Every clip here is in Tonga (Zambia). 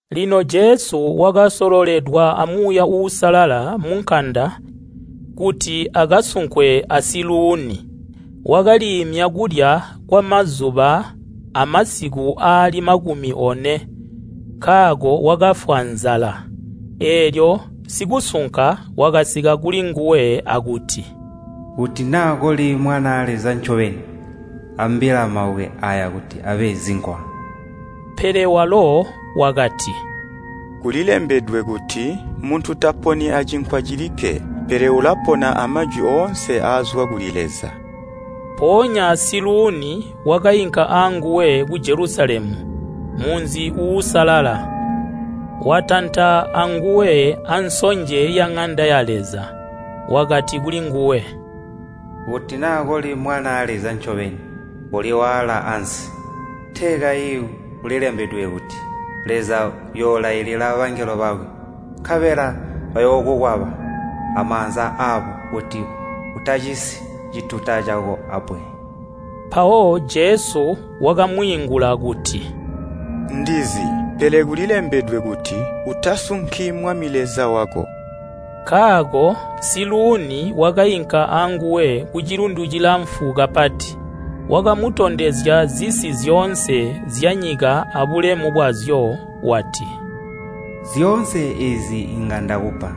Lino Jesu wakasololelwa a Muuya Uusalala munkanda kuti akasunkwe a Siluuni. Wakaliimya kulya kwamazuba amasiku aali makumi one, nkaako wakafwa nzala. Eelyo sikusunka wakasika kulinguwe akuti, “Kuti naa koli Mwanaa Leza ncobeni, ambila mabwe aaya kuti abe zinkwa.” Pele walo wakati, “Kulilembedwe kuti, ‘Muntu taponi acinkwa cilikke, pele ulapona amajwi oonse aazwa kuli Leza.’” Mpoonya Siluuni wakainka anguwe ku Jelusalemu, munzi uusalala, watanta anguwe ansonje ya Ŋanda ya Leza. Wakati kulinguwe, “Kuti naa koli Mwanaa Leza ncobeni koliwaala ansi! Tee kayi kulilembedwe kuti, ‘Leza uyoolailila bangelo bakwe, nkabela bayookukwaba amaanza aabo kuti utacisi cituta cako abbwe.’” Mpawo Jesu wakamwiingula kuti, “Ndizi, pele kulilembedwe kuti, ‘Utasunki Mwami Leza wako!’” Nkaako Siluuni wakainka anguwe kucilundu cilamfu kapati. Wakamutondezya zisi zyoonse zyanyika abulemu bwazyo wati, “Zyoonse eezi inga ndakupa,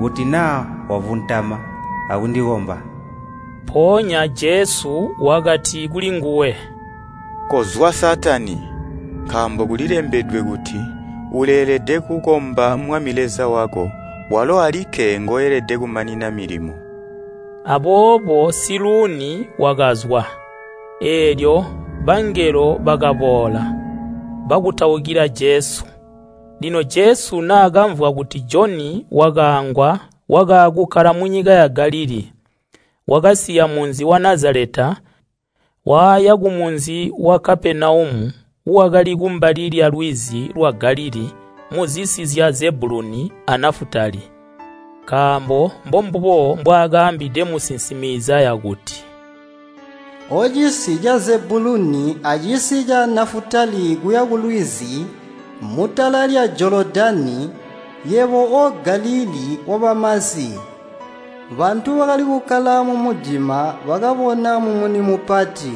kuti naa wavuntama akundikomba.” Mpoonya Jesu wakati kulinguwe, “Kozwa Saatani! Nkaambo kulilembedwe kuti, ‘Uleelede kukomba Mwami Leza wako, walo alikke ngoelede kumanina milimo.’” Aboobo Siluuni wakazwa, eelyo bangelo bakaboola, bakutaukila Jesu. Lino Jesu naakamvwa kuti Joni wakaangwa wakaakukkala munyika ya Galilii. Wakasiya munzi wa Nazaleta waya kumunzi wa Kapenaumu wakali kumbali lyalwizi lwa Galilii muzisi zya Zebuluni a Nafutali. Nkaambo mbombubo mbwaakaambide musinsimi Izaya kuti, “Ocisi ca Zebuluni acisi ca Nafutali kuya kulwizi, mutala lya Jolodani. Yebo o Galilii wabamasi! Bantu bakali kukkala mumudima bakabona mumuni mupati,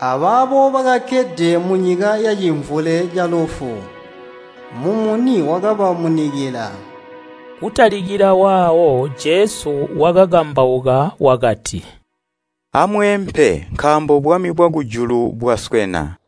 abaabo bakakkede munyika yacimvule calufu, mumuni wakabamunikila.” Kutalikila waawo Jesu wakakambauka wakati, “Amweempe nkaambo bwami bwakujulu bwaswena.”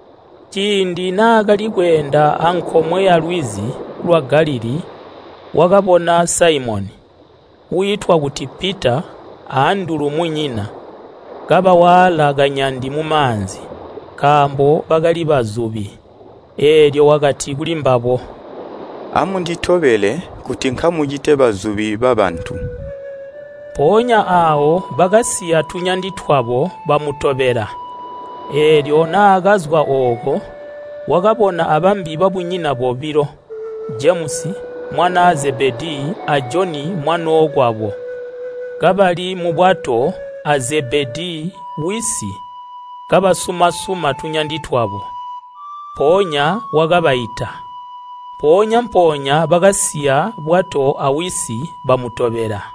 Ciindi naakali kweenda ankomwe yalwizi lwa Galilii, wakabona Saimoni, wiitwa kuti Pita a Andulu munyina, kabawaala kanyandi mumaanzi. Nkaambo bakali bazubi. Eelyo wakati kulimbabo, “Amunditobele, kuti nkamucite bazubi babantu.” Mpoonya aawo bakasiya tunyandi twabo, bamutobela. Eelyo naakazwa ooko, wakabona abambi babunyina bobilo, Jemusi, mwanaa Zebedii a Joni mwanookwabo, kabali mubwato a Zebedii wisi kabasuma-suma tunyandi twabo, mpoonya wakabaita. Mpoonya-mpoonya bakasiya bwato awisi, bamutobela.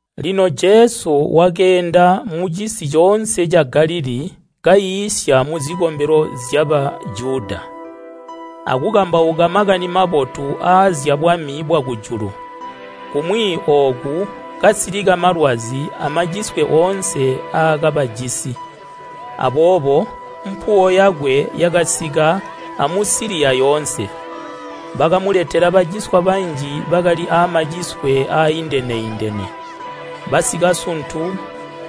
Lino Jesu wakeenda mucisi coonse ca Galilii kaiisya muzikombelo zya Bajuda akukambauka Makani Mabotu aazyabwami bwakujulu, kumwi ooku kasilika malwazi amaciswe oonse aakabajisi. Aboobo mpuwo yakwe yakasika a Musiliya yoonse. Bakamuletela baciswa banji bakali aamaciswe aaindene-indene, basikasuntu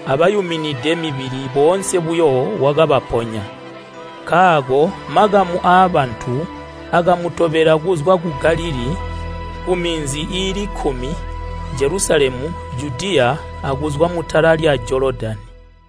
abayuminide mibili boonse buyo wakabaponya. Nkaako makamu aabantu akamutobela kuzwa ku Galilii, ku Minzi iili kkumi, Jelusalemu, Judiya akuzwa mutala lya Jolodani.